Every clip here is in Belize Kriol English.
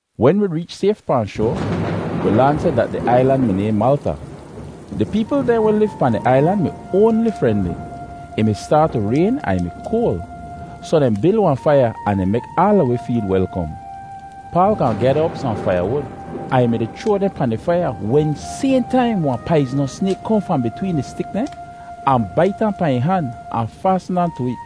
Wen wi reech sayf pahn shoa, wi laan seh dat di ailan mi nayhn Malta. Di peepl dehn weh liv pahn di ailan mi oanli frenli. Ih mi staat tu rayn ahn ih mi koal, soh dehn bil wahn faiya ahn dehn mek aala wi feel welkom. Paal gaahn gyada op sohn faiyawud ahn ih mi-di chroa dehn pahn di faiya wen sayhn taim wahn paiznos snayk kohn fahn bitween di stik dehn ahn bait ahn pahn ih han ahn faasn aan tu it.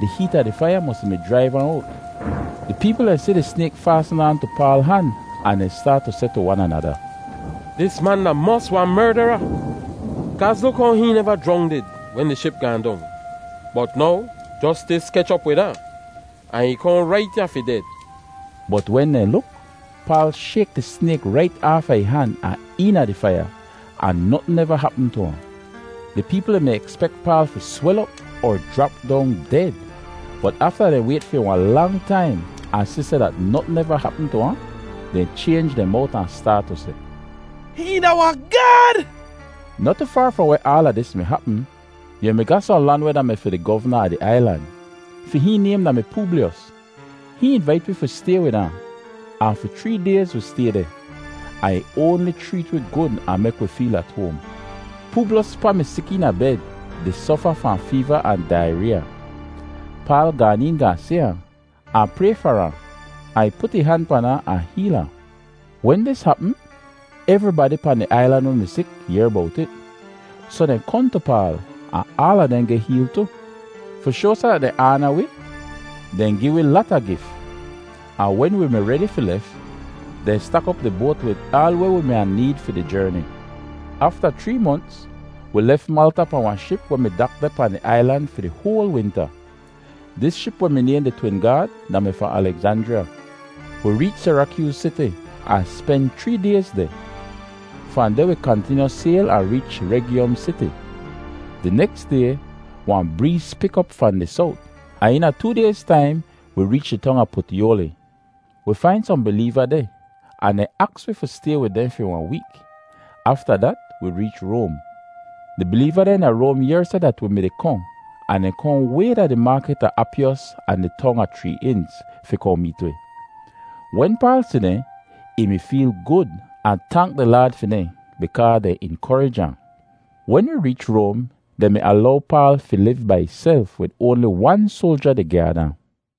Di heet a di faiya mosi mi jraiv ahn owt. Di peepl dehn si di snayk faasn aan tu Paal han ahn dehn staat tu seh tu wan anada, “Dis man da mos wahn merdara! Kaaz luk how hihn neva jrongdid wen di ship gaahn dong, bot now Jostis kech op wid ahn, ahn ih kohn rait ya fi ded.” Bot wen dehn luk, Paal shayk di snayk rait aafa ih han ahn eena di faiya, ahn notn neva hapm tu ahn. Di peepl dehn mi ekspek Paal fi swel op er jrap dong ded, bot afta dehn wayt fi wahn lang taim ahn si seh dat notn neva hapm tu ahn, dehn chaynj dehn mowt ahn staat tu seh, “Hihn da wahn Gaad!” Noh tu faar fahn weh aala dis mi hapm, yu mi ga sohn lan weh da-mi fi di govna a di ailan. Fi hihn naym da-mi Pooblyos. Hihn invait wi fi stay wid ahn, ahn fi chree dayz wi stay deh, ahn ih oanli chreet wi gud ahn mek wi feel at hoam. Pooblyos pa mi sik eena bed di sofa fahn feeva ahn daireeya. Paal gaan een gaahn si ahn, ahn pray far ahn, ahn ih put ih han pan ahn, ahn heel ahn. Wen dis hapm, evribadi pahn di ailan weh mi sik yehr bowt it, soh dehn kohn tu Paal ahn aala dehn geh heel tu. Fi shoa seh dat dehn aana wi, dehn gi wi lata gif, ahn wen wi mi redi fi lef, dehn stak op di boat wid aal weh wi mi wahn need fi di jerni. Afta chree monts wi lef Malta pahn wahn ship weh mi dak deh pahn di ailan fi di hoal winta. Dis ship weh mi nayhn “Di Twin Gaad” da-mi fahn Alegzanjriya. Wi reech Sirakyooz Siti ahn spen chree dayz deh. Fahn deh wi kantinyu sayl ahn reech Regyom Siti. Di neks day wahn breez pik op fahn di sowt, ahn eena too dayz taim wi reech di tong a Putyoli. Wi fain sohn bileeva deh ahn dehn aks wi fi stay wid dehn fi wahn week. Afta dat wi reech Roam. Di bileeva dehn da Roam yehr seh dat wi mi-di kohn ahn dehn kohn way da di Maakit a Apyos ahn di tong a Chree Inz, fi kohn meet wi. Wen Paal si dehn, ih mi feel gud ahn tank di Laad fi dehn bikaa dehn inkorij ahn. Wen wi reech Roam dehn mi alow Paal fi liv bai ihself wid oanli wan soalja di gyaad ahn.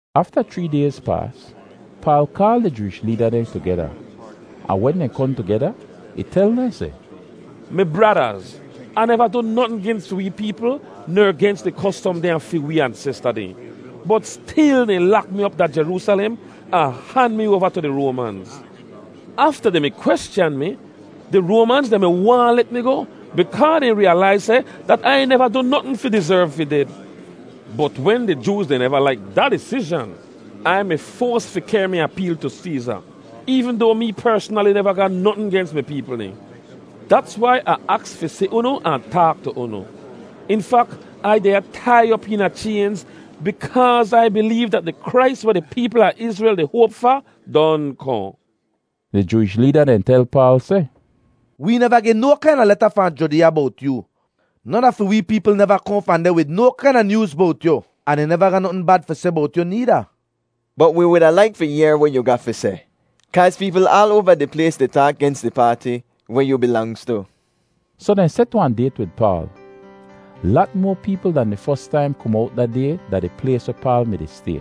Afta chree dayz paas, Paal kaal di Jooish leeda dehn tugeda, ahn wen dehn kohn tugeda, ih tel dehn seh, “Mi bradaz, Ah neva du notn gens fi wee peepl ner gens di kostom dehn a fi wee ansesta dehn, bot stil dehn lak mi op da Jeroosalem ahn han mi oava tu di Roamanz. Afta dehn mi kweschan mi, di Roamanz dehn mi waahn let mi goh bikaa dehn riyalaiz seh dat Ai neva du notn fi dizerv fi ded. Bot wen di Jooz dehn neva laik da disizhan, Ai mi foas fi kehr mi apeel tu Seeza, eevn doa mee persnali neva ga notn gens mi peepl dehn. Dats wai Ah aks fi si unu ahn taak tu unu. In fak, Ai deh ya tai op eena chaynz bikaaz Ai bileev dat di Krais weh di peepl a Izrel di hoap fa don kohn.” Di Jooish leeda dehn tel Paal seh, “Wee neva geh no kaina leta fahn Judeeya bowt yoo. Non a fi wee peepl neva kohn fahn deh wid no kaina nyooz bowt yu, ahn dehn neva ga notn bad fi seh bowt yu needa. Bot wi wuda laik fi yehr weh yu ga fi seh kaaz peepl aal oava di plays di taak gens di paati weh yu bilangz tu.” Soh dehn set wahn dayt wid Paal. Lat moa peepl dan di fos taim kom owt da day da di plays weh Paal mi-di stay.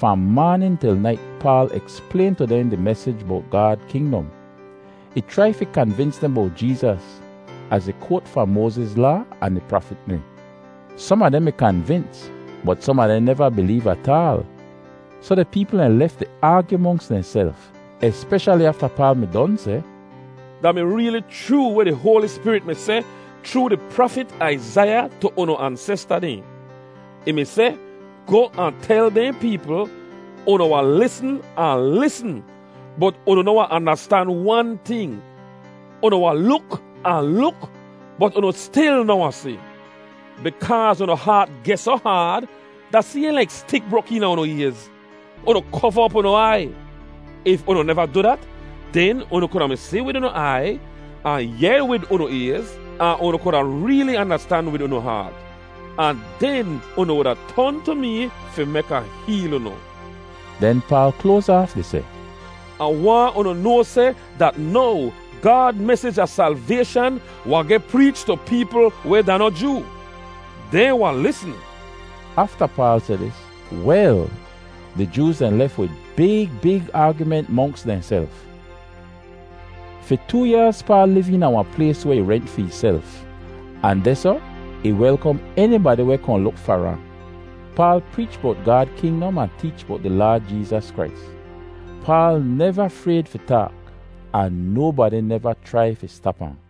Fahn maanin til nait Paal eksplayn tu dehn di mesij bowt Gaad kingdom. Ih chrai fi kanvins dehn bowt Jeezas az ih koat fahn Moaziz Laa ahn di prafit dehn. Som a dehn mi kanvins bot som a dehn neva bileev ataal. Soh di peepl dehn lef di aagyu monks dehnself, espeshali afta Paal mi don seh, “Da mi reeli chroo weh di Hoali Spirit mi seh chroo di prafit Aizaiya tu unu ansesta dehn. Ih mi seh, ‘Goh ahn tel dehn peepl: Unu wahn lisn ahn lisn, bot unu noh wahn andastan wan ting. Unu wahn luk ahn luk, bot unu stil noh wahn si. Bikaaz unu haat geh soh haad, da sayhn laik stik brok eena unu ayz. Unu kova op unu aiy. If unu neva du dat, den unu kuda mi si wid unu aiy, ahn yehr wid unu ayz, ahn unu kuda reeli andastan wid unu haat, ahn den unu wuda ton tu mee fi mek Ah heel unu.’” Den Paal kloaz aaf di seh, “Ah waahn unu noa seh dat now Gaad mesij a salvayshan wahn geh preech tu peepl weh da noh Joo. Dehn wahn lisn!” Afta Paal seh dis, wel, di Jooz dehn lef wid big big aagyument monks dehnself. Fi too yaaz Paal liv eena wahn plays weh ih rent fi ihself ahn dehsoh ih welkom enibadi weh kohn luk far ahn. Paal preech bowt Gaad kingdom ahn teech bowt di Laad Jeezas Krais. Paal neva frayd fi taak ahn nobadi neva chrai fi stap ahn.